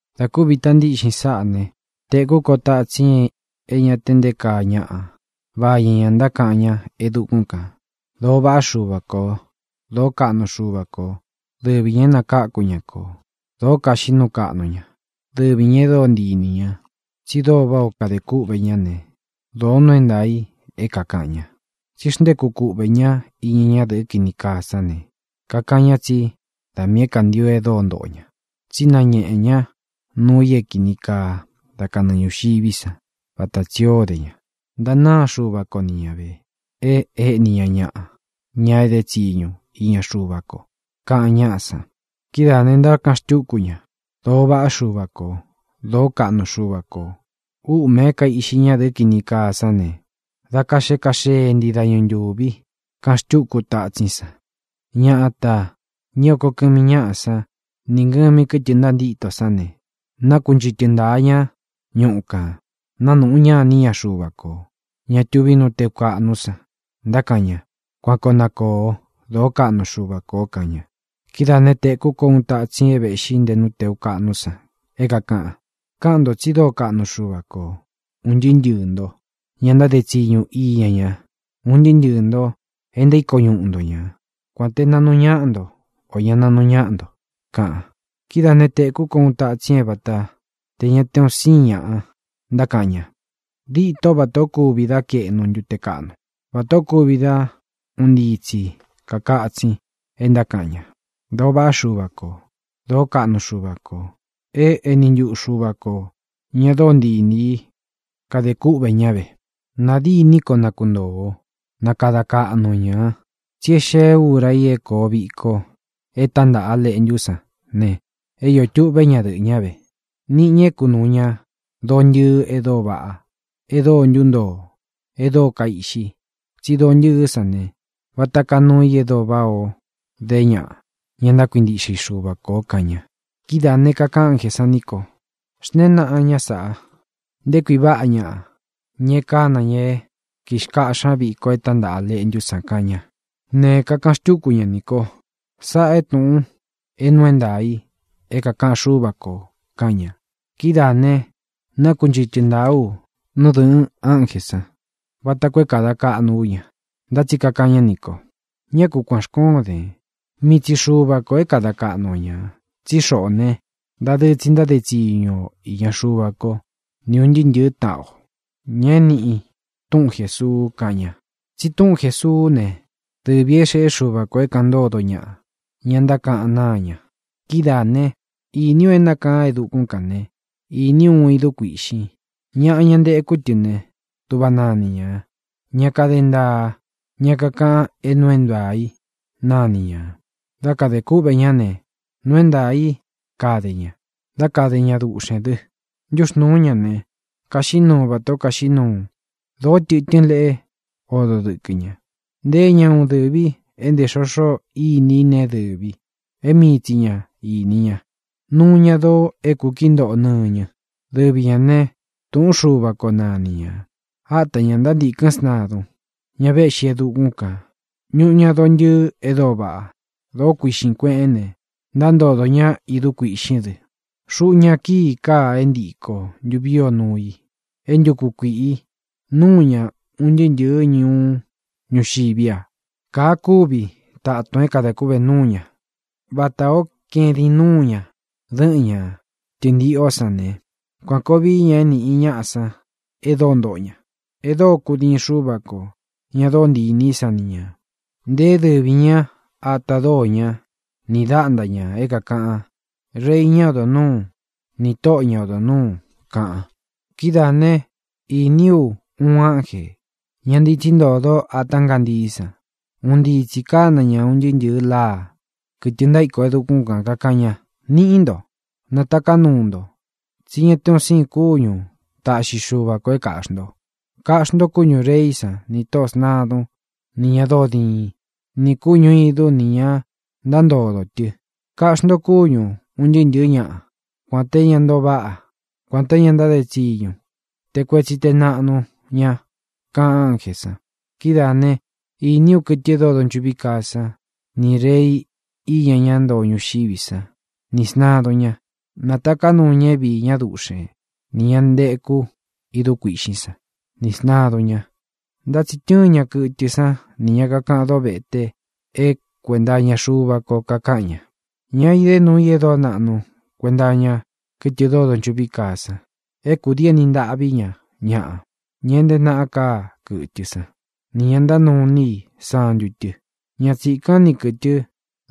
Dā kúvi ita ntíꞌxin sáꞌā né, tēkú ko tatsin é ña te nté kaa ñaꞌa vañɨ ñā ntákaꞌan ñá e dukún kān: ¡Dōo vaꞌá Xuva kō! ¡Dōó kaꞌnu Xuva kō! Dɨvi ñā é nakáku ña kō. Dōo kaxiꞌí nuu kaꞌnu ña. Dɨvi ñā e dóo ntii inī ña. Tsi dóo váꞌā ó kadē kúꞌvē ñá ne, dōo nuu é ntaā i é kākaꞌan ña. Tsí xntéku kuꞌvē ñá iña ñadɨ́ꞌɨ kini kaa sán ne, kakaꞌan ña tsí da miī é kāntio e dóo ntoꞌo ña, tsí nañéꞌe ña nuu i é kīni kaa dá kanɨɨ ñūxiví san, vata tsī o dé ña. Ntanáa Xuva ko ni ña vē, e éꞌní ña ñaꞌa, ña edé tsiñu iña Xuva ko, kaꞌan ñáꞌa san. Kidáā ne, ntákaꞌan xtúku ña: —¡Dōo vaꞌá Xuva kō! ¡Dōó kaꞌnu Xuva kō! Úꞌmē é kaīꞌxi ñadɨ́ꞌɨ kini kaa sán ne, dá kaxee kaxee ntii dañu ntūvi —kaꞌan xtúku tatsín san. Ñatā, ña é oko kɨmi ñáꞌá san nī ngɨmi kɨ́tɨ ntantíto sán ne, nákunchɨtɨ ntāa ña ñúꞌu kān, nanúꞌu ña iní ña Xuva kō, ña tuví nú tēu kaꞌnú san, ntákaꞌan ña: —¡Kuan koo na kōo! ¡Dōó kaꞌnu Xuva kō! —kaꞌan ña. Kidáā né, tēkú ko uun tatsin é vēꞌxí nte nú tēu kaꞌnú san, é kākaꞌan: ¡Káꞌan ntō tsi dóo kaꞌnu Xuva kō, un ntɨɨ́ ntɨɨ̄ ntó, ña ntáde tsiñu iña ña, un ntɨɨ́ ntɨɨ̄ nto e ntaíko ñuꞌu nto ña, kuān té naꞌnu ñáꞌa nto, ō ña naꞌnu ñáꞌa nto!, kaꞌan. Kidáā né, tēkú ko uun tatsin é vata tē ña te un síin ñaꞌa ntákaꞌan ña. Dîtó vatā ó kuvi dá kaeꞌnu ntute kaꞌnu, vatā ó kuvi dá un ntii tsi kākatsin, e ntákaꞌan ña: ¡Dōo vaꞌá Xuva kō! ¡Dōó kaꞌnu Xuva kō! E éni ntuꞌu Xuva ko, ña dóo ntii inī í, kade kúꞌvē ñá ve. Nā dîní koo nakuntōo o. Na kada kaꞌnu o ñā, tsí e xée ura i é kōo viko e tántaꞌa A Leꞌntú san ne, é iō tuꞌvé ñadɨꞌɨ̄ ñá ve. Níꞌi ñā é kunūu ña doo ntɨɨ e dóo vaꞌá, e dóo ntuntoo, e dóo kaiꞌxi. Tsí doo ntɨɨ́ san ne, vata kaa nuu i e dóo váꞌā ó de ñaꞌa, ña ntákuintiꞌxe i Xuva kō, kaꞌan ña. Kidáā ne, kakaꞌan ánjē sán nī ko: —Xntēén naꞌan sáꞌa: “Nté kui váꞌa ñaꞌa, ña e kána ña é kikáꞌxi ña víko e tántaꞌa A Leꞌntú san” —kaꞌan ña. Ne, kakaꞌan xtúku ña nī ko: —Sáꞌā é tūꞌun é nuu é ntaā i é kakaꞌan Xúva kō —kaꞌan ña. Kidáā ne, nákunchɨtɨ ntāá u nú dɨ̄ꞌɨn ánjē sán vata koo é kāda kaꞌnu ú ña, ntá tsi kakaꞌan ñá nī ko: —¡Ñá ku kuān xkoón den! Mii tsi Xuva kō é kada kaꞌnu o ñā. Tsí xoꞌō né, dadɨɨ tsi ntáde tsiñu o īña Xuva kó, ni ūn ntɨɨ́ ntɨ̄ɨ́ taꞌan o, ña é nīꞌi túꞌun Jēsuu —kaꞌan ña. Tsi túꞌun Jēsuú ne, dɨvī é xeꞌé Xuva kō é kāꞌan ntódo ñaꞌa, ña ntákaꞌan náa ña. Kidáā né, īní u e nákaan e dukún kān né, īní u uun idú kuīꞌxin. Ñaꞌa, ña ntekú tɨ ne, dúꞌva nani ñā: Ña Kade Ntaa, Ña Kakaꞌan é Nuu é Ntaā í nani ñā. Dá kadē kúꞌvē ñá ne, nuu é ntaā í kade ña; dá kade ña duꞌxēn dɨ. Ntúxnūú ña ne, kaxiꞌí nuu vatā ó kaiꞌxi ñúꞌu. Dōó tɨtɨ́n leꞌe odo dɨ́kɨ ña. Nteé ña uun dɨ̄vi é ntē xoxo íni i neé dɨ̄vi, é mii tsi ña īni ña. Nuu ña doo é kūkií ntoꞌo nɨñɨ. Dɨvī ñá ne, Tūꞌún Xuva ko nani ñā. Áta ñā ntántīkɨ́n sntadun, ña véꞌxi e dukún kān. Ñuꞌu ña doo ntɨɨ e dóo vaꞌá, doo kuîꞌxín kueꞌén ne, ntántodō ñá idú kuīꞌxín dɨ. Xuꞌu ña kíi káa é ntīko ntuví o nuu i, é ntūku kuiꞌi núu ña un ntɨɨ́ ntɨ̄ɨ́ ñuú ñuxiví a. Kāa kúvi tatun é kadā kúꞌvē núu ña. Vatā ó kaedín nuu ña dɨ́ꞌɨn ña tɨ̄ntiꞌó san ne, kuān koo vií ña é nīꞌi ñaꞌa san e dóo ntoꞌo ña, e dóo kudíin Xuva kō, ña dóo ntii inī í san ni ñā. Nteé dɨvī ñá ata dóo ña ni dāꞌntá ña, é kākaꞌan: “Rei, ñá odo nūú, nī Tóꞌo, ña odo nūu”, kaꞌan. Kidáā né, īní u uun ánjē, ña ntitsí ntōdo ata ngántií san. Un ntii tsī kána ña un ntɨɨ́ ntɨ̄ɨ láa, kɨtɨ ntaíko e dukún kān, kakaꞌan ña: —Niꞌí nto, nataká nuu nto, tsí ña te un siin kúñu taꞌxi Xuva kō é kāꞌxi nto. Kaꞌxí nto kúñū reí san nī tóꞌō sntadun ni ña dóo diin, nī kúñu īdú nī ña ntántodō tɨ. Kaꞌxí nto kúñu ūn ntɨɨ́ ntɨ̄ɨ́ ñaꞌa, kuān te ñá ntoo váꞌa, kuān te ñá ntáde tsiñu, te kuetsi te naꞌnu ña —kaꞌan ánjē san. Kídaā né, īní u kɨtɨ e dóo donchuꞌví kaa san, nī rei iña ñá ntoo ñuxiví san, nī sntadun ña. Nātaká nuu ña é viī ñá duꞌxen nī ña nteku idú kuīꞌxín san, nī sntadun ña. Ntá tsi tɨ́ɨn ña kɨtɨ sán nī ña kakaꞌan dóvete é kuenta iña Xuva ko kakáꞌan ña, ña idé nuu i e dóo naꞌnu kuenta iña kɨtɨ dóo donchuꞌví kaa san, é kūdii éni ntaꞌví ña ñaꞌa, ña é nteé naꞌa káa kɨtɨ san, nī ña ntánuu iní i santu tɨ. Ña tsīkán ni kɨ̄tɨ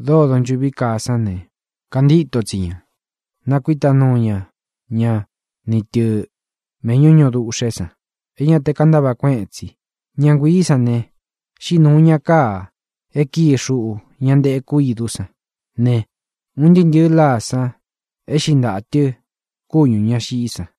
dóo donchuꞌví kaa sán ne, kantíto tsi ña, nakuíta nuu ña ña ni tɨ̄ méꞌñu ñūꞌu duꞌxé san é ña te kantáꞌva kueꞌen tsi. Ña nguiī sán ne, xíꞌi nūu ña káa e kíi xuꞌu ña nteku idú san ne, un ntɨɨ́ ntɨ̄ɨ láa san éꞌxi ntaꞌā tɨ kúñū ña xiꞌí san.